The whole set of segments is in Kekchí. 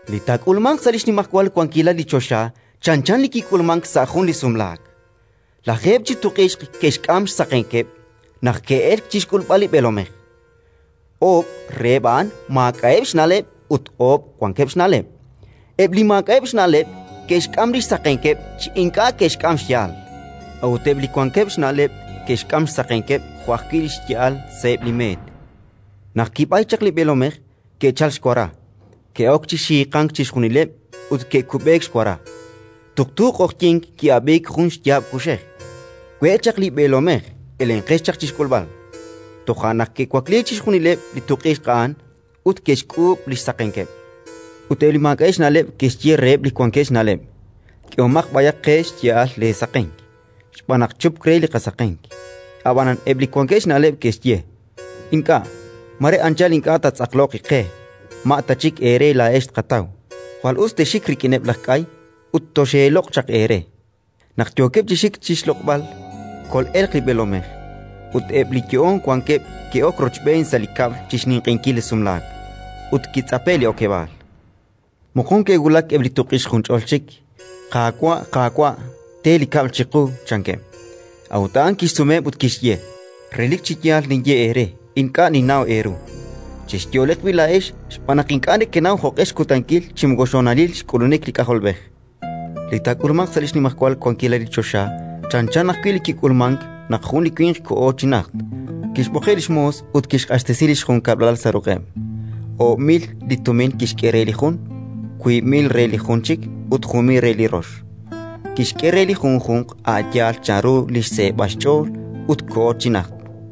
“Li taak'ulmanq sa' li xnimajwal wankilal li choxa chanchan li kik'ulmank sa' jun li sumlaak. Lajeeb' chi tuq'ixq ke'xk'am xsaqenkeb' naq ke'elk chi xk'ulb'al li b'eelomej. Oob' reheb' a'an maak'a'eb' xna'leb' ut oob' wankeb' xna'leb'. “Eb' li maak'a'eb' xna'leb' ke'xk'am li xsaqenkeb' chi ink'a' ke'xk'am xya'al; a'ut eb' li wankeb' xna'leb' ke'xk'am xsaqenkeb' jo' ajwi' li xya'al sa'eb' li meet. Naq kib'ayk chaq li b'eelomej, ke'chalk xwara, ke'ok chi xiiqank chixjunileb' ut ke'kub'eek xwara. “Tuqtu q'oqyink ki'ab'iik jun xyaab' kuxej: «We' chaq li b'eelomej! Elenqex chi xk'ulb'al!». Toja' naq ke'wakliik chixjunileb' li tuq'ixq a'an ut ke'xk'uub' li xsaqenkeb'. Ut eb' li maak'a'eb' xna'leb' ke'xye reheb' li wankeb' xna'leb': «K'ehomaq b'ayaq qe xya'al leesaqenk, xb'aan naq chupk re li qasaqenk». Ab'anan eb' li wankeb' xna'leb' ke'xye: «Ink'a', mare anchal ink'a' taatz'aqloq iqe; ma' ta chik eere laa'ex tqataw. Jwal us texxik rik'ineb' laj k'ay ut toxeeloq' chaq eere». “Naq yookeb' chi xik chi xloq'b'al, kol'elq li b'eelomej, ut eb' li yo'oon wankeb' ke'ok rochb'een sa' li kab'l chi xninq'ehinkil li sumlaak; ut kitz'ape'k li okeb'aal. “Moqon ke'wulak eb' li tuq'ixq junch'ol chik: «Qaawa', Qaawa', te li kab'l chiqu!», chankeb'. A'ut a'an kixsumeheb' ut kixye: «Relik chi yaal ninye eere, ink'a' ninnaw eeru». “Chexyo'leq b'i' laa'ex, xb'aan naq ink'a' nekenaw jo'q'e xkutankil chi moko li xhonalil xk'ulunik li K'ajolb'ej. “Li taak'ulmanq sa' li xnimajwal wankilal li choxa chanchan ajwi' li kik'ulmank naq jun li winq koho chi najt; kixb'oqeb' li xmoos ut kixq'axtesi li xjunkab'lal sa' ruq'eb'. Oob' mil li tumin kixk'e re li jun, wiib' mil re li jun chik ut jun mil re li rox: kixk'e re li junjunq a' yaal chanru li xseeb'al xch'ool; ut koho chi najt.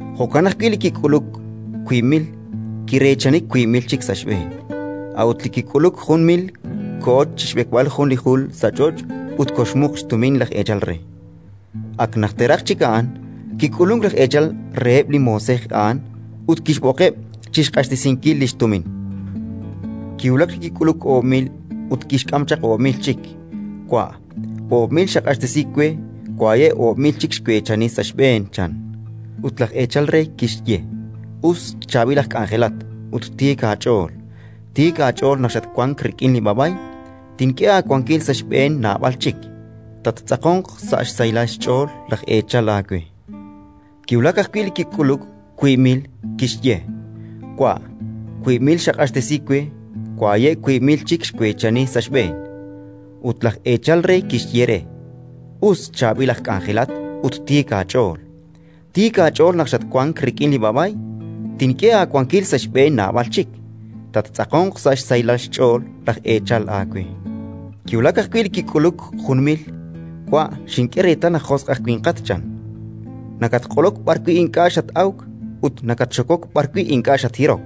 Jo'kan ajwi' li kik'uluk wiib' mil, kireechani wiib' mil chik sa' xb'een. A'ut li kik'uluk jun mil koho chi xb'ekb'al jun li jul sa' ch'och' ut koxmuq xtumin laj eechal re. “Ak najteraq chik a'an, kik'ulunk laj eechal reheb' li moosej a'an ut kixb'oqeb' chi xq'axtesinkil li xtumin. Kiwulak li kik'uluk oob' mil ut kixk'am chaq oob' mil chik: «Wa', oob' mil kaq'axtesi we; waye' oob' mil chik xweechani sa' xb'een», chan. Ut laj eechal re kixye: «Us, chaab'il aj k'anjelat ut tiik aach'ool! Tiik aach'ool naq xatwank rik'in li b'a'b'ay, tink'e aawankil sa' xb'een naab'al chik. Tattz'aqonq sa' xsahilal xch'ool laj eechal aawe». “Kiwulak ajwi' li kik'uluk wiib' mil; kixye: «Wa', wiib' mil kaq'axtesi we; waye' wiib' mil chik xweechani sa' xb'een». Ut laj eechal re kixye re: «Us, chaab'il aj k'anjelat ut tiik aach'ool! Tiik aach'ool naq xatwank rik'in li b'a'b'ay, tink'e aawankil sa' xb'een naab'al chik. Tattz'aqonq sa' xsahilal xch'ool laj eechal aawe». “Kiwulak ajwi' li kik'uluk jun mil: «Wa', xink'e reetal naq josq' aj winqat -chan-. Nakatq'olok b'arwi' ink'a' xat-awk ut nakatxokok b'arwi' ink'a' xathirok.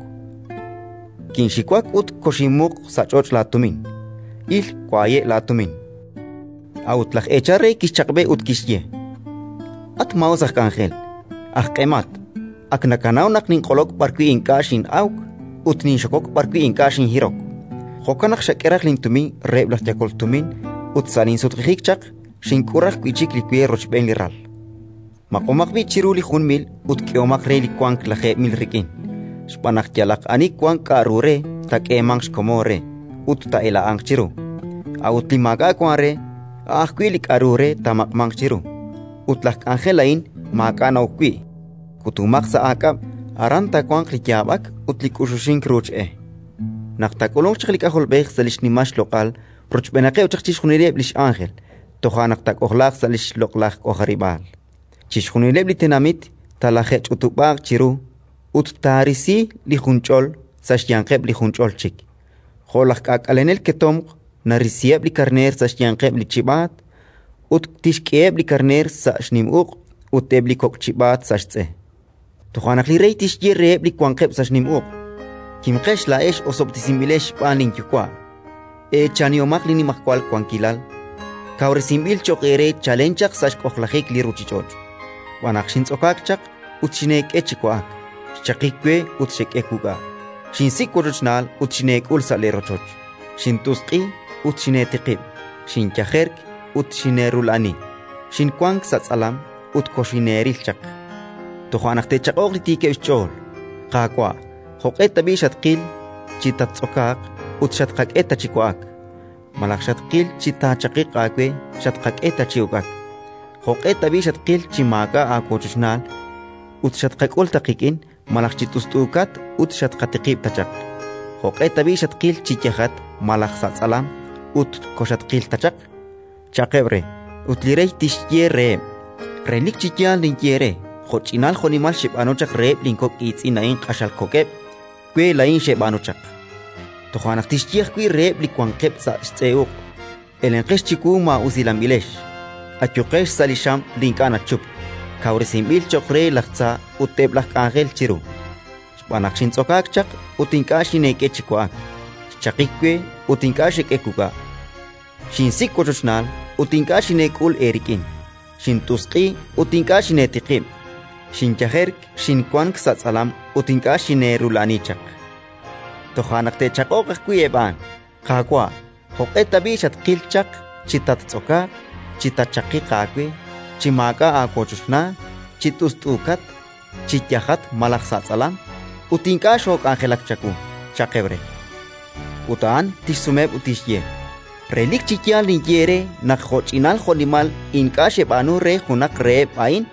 Kinxiwak ut koxinmuq sa' ch'och' laatumin. Il, waye' laatumin». A'ut laj eechal re kixchaq'b'e ut kixye: «At maa'us aj k'anjel, aj q'emat! Ak nakanaw naq ninq'olok b'arwi' ink'a' xin'awk ut ninxokok b'arwi' ink'a' xinhirok. Jo'kan naq xak'e raj lintumin reheb' laj yakol tumin ut sa' linsutq'ijik chaq, xink'ul raj wi' chik li we rochb'een li ral. Maq'omaq b'i' chiru li jun mil ut k'ehomaq re li wank lajeeb' mil rik'in. Xb'aan naq yalaq ani wank k'aru re, taak'eemanq xkomon re ut taa'ela'anq chiru; a'ut li maak'a' wank re, a' ajwi' li k'aru re taamaq'manq chiru. Ut laj k'anjel a'in li maak'a' na'ok wi', kutomaq sa' aak'ab'. Aran taawanq li yaab'ak ut li k'uxuxink ruuch e». “Naq taak'ulunq chaq li K'ajolb'ej sa' li xnimal xloq'al rochb'eenaqeb' chaq chixjunileb' li x'ánjel, toja' naq taak'ojlaaq sa' li xloq'laj k'ojarib'aal. Chixjunileb' li tenamit talaje'ch'utub'aaq chiru, ut taarisi li junch'ol sa' xyanqeb' li junch'ol chik, jo' laj k'aak'alenel ketomq narisiheb' li karneer sa' xyanqeb' li chib'aat. Ut tixk'eheb' li karneer sa' xnim uq', ut eb' li kok' chib'aat sa' xtz'e. “Toja' naq li Rey tixye reheb' li wanqeb' sa' xnim uq': «Kimqex laa'ex, osob'tesinb'ilex xb'aan linYuwa'! Eechanihomaq li nimajwal wankilal kawresinb'il cho'q eere chalen chaq sa' xk'ojlajik li ruuchich'och'. Xb'aan naq xintz'okaak chaq, ut xineek'e chi wa'ak; xchaqik we, ut xek'e wuk'a'; xinsik' wochochnaal, ut xineek'ul sa' leerochoch. Xint'usq'i, ut xineetiqib'; xinyajerk, ut xineerula'ani; xinwank sa' tz'alam, ut koxineeril chaq». “Toja' naq te'chaq'oq li tiikeb' xch'ool: «Qaawa', jo'q'e tab'i' xatqil chi tattz'okaaq, ut xatqak'e ta chi wa'ak; malaj xatqil chi taachaqiq aawe, ut xatqak'e ta chi uk'ak? Jo'q'e tab'i' xatqil chi maak'a' aawochochnaal, ut xatqak'ul ta qik'in; malaj chi t'ust'uukat, ut xatqatiqib' ta chaq? Jo'q'e tab'i' xatqil chi yajat malaj sa' tz'alam, ut koxatqil ta chaq?», cha'qeb' re. Ut li Rey tixye reheb': «Relik chi yaal ninye eere: jo'ch'inal jo'nimal xeb'aanu chaq reheb' linkok' iitz'in a'in q'axal kok'eb', we laa'in xeb'aanu chaq». “Toja' naq tixye ajwi' reheb' li wanqeb' sa' xtz'e uq': «Elenqex chiwu, maa'usilanb'ilex. Ayuqex sa' li xam li ink'a' nachup, kawresinb'il cho'q re laj tza ut eb' laj k'anjel chiru. Xb'aan naq xintz'okaak chaq, ut ink'a' xineek'e chi wa'ak; xchaqik we, ut ink'a' xek'e wuk'a'; xinsik' wochochnaal, ut ink'a' xineek'ul eerik'in; xint'usq'i, ut ink'a' xineetiqib'; xinyajerk, xinwank sa' tz'alam, ut ink'a' xineerula'ani chaq». “Toja' naq te'chaq'oq ajwi' eb' a'an: «Qaawa', jo'q'e tab'i' xatqil chaq chi tattz'okaaq, chi taachaqiq aawe, chi maak'a' aawochochnaal, chi t'ust'uukat, chi yajat malaj sa' tz'alam, ut ink'a' xook'anjelak chawu?», cha'qeb' re. Ut a'an tixsumeheb' ut tixye: «Relik chi yaal ninye eere naq jo'ch'inal jo'nimal ink'a' xeb'aanu re junaq reheb' a'in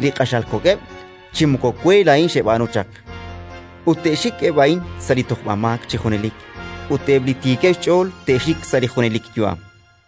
li q'axal kok'eb', chi moko we laa'in xeb'aanu chaq». Ut te'xik eb' a'in sa' li tojb'amaak chi junelik, ut eb' li tiikeb' xch'ool te'xik sa' li junelik yu'am”.